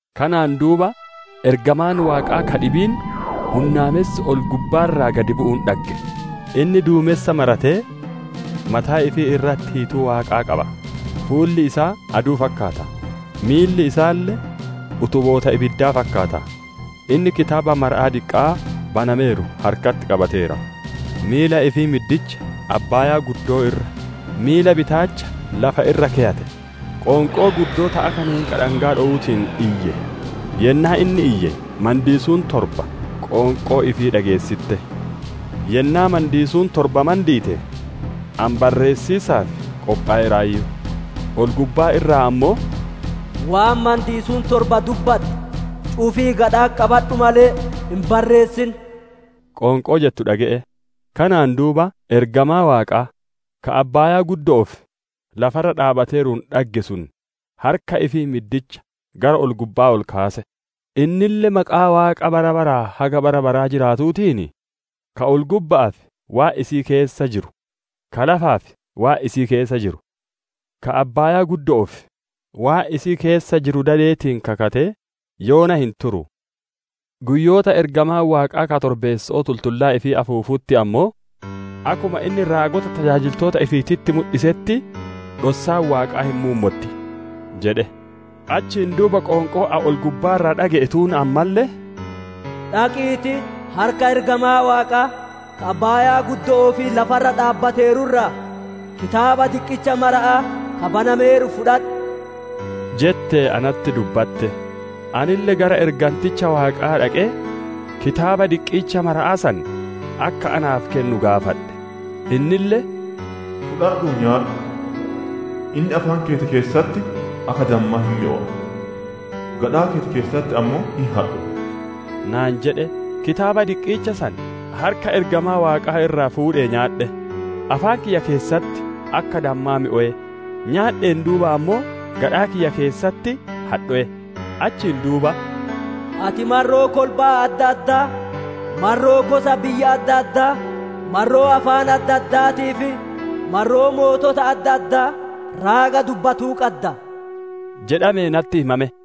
Kanaan duuba ergamaan Waaqaa ka dhibiin hunnaamessi ol-gubbaa irraa gadi bu'uun dhagge. Inni duumensa maratee, mataa ifii irratti hiituu Waaqaa qaba; fuulli isaa aduu fakkaata; miilli isaalle utuboota ibiddaa fakkaata. Inni Kitaaba maramaa diqqaa banameeru harkatti qabateera; miila ifii middicha abbaayaa irra, miila bitaacha lafa irra keyate; qoonqoo guddoo ta akka neenqa dhangaa dhowuutiin iyye. Yennaa inni iyye mandiisuun torba qoonqoo ifii dhageessitte. Yennaa mandiisuun torba mandiite, ani barreessiisaaf qophoweeraayyu; ol-gubbaa irraa ammoo, «Waan mandiisuun torba dubbatte cufii gadha'atti qabadhu malee, hin barreessin» qoonqoo jettu dhage'e. Kanaan duuba ergamaa Waaqaa ka abbaaya'aa fi lafa irra dhaabbateeruun dhagge sun harka ifii middicha gara ol-gubba'aa ol kaase. Innille maqaa Waaqa bara baraa haga bara baraa jiraatuutiin, ka ol-gubba'aa fi waan isii keessa jiru, ka lafaa fi waan isii keessa jiru, ka abbaaya'aa fi waan isii keessa jiru dadeetiin kakatee, «Yoona hin turu! Guyyoota ergamaan Waaqaa ka torbeesso'oo tultullaa ifii afuufutti ammoo, akkuma inni tajaajiltoota ifii raagotatti mudhisetti dhossaan Waaqaa hin muummotti» jedhe. Achiin duuba qoonqoon ani ol-gubbaa irraa dhage'e tuun ammalle, «Dhaqiitii harka ergamaa Waaqaa, ka abbaaya'aa fi lafa irra dhaabbateeru irraa, Kitaaba diqqicha maramaa, ka banameeru fudhadhu» jettee natti dubbatte. Anille gara erganticha Waaqaa dhaqee Kitaaba diqqicha maramaa san akka naaf kennu gaafadhe; innille, «Fudhadhuu nyaadhu! Inni afaan keeti keessatti akka dammaa hin mi'owa, gadhaa keeti keessatti ammoo hin hadhowa» naan jedhe. Kitaaba diqqicha san harka ergamaa Waaqaa irraa fuudhee nyaadhe; afaan kiyya keessatti akka dammaa mi'owe; nyaadheen duuba ammoo gadhaa kiyya keessatti hadhowe. Achiin duuba, «Ati marroo kolbaa adda addaa, marroo gosa biyya adda addaa, marroo afaan adda addaatii fi marroo mootota adda addaa raaga dubbatuu qadda» jedhamee natti himame.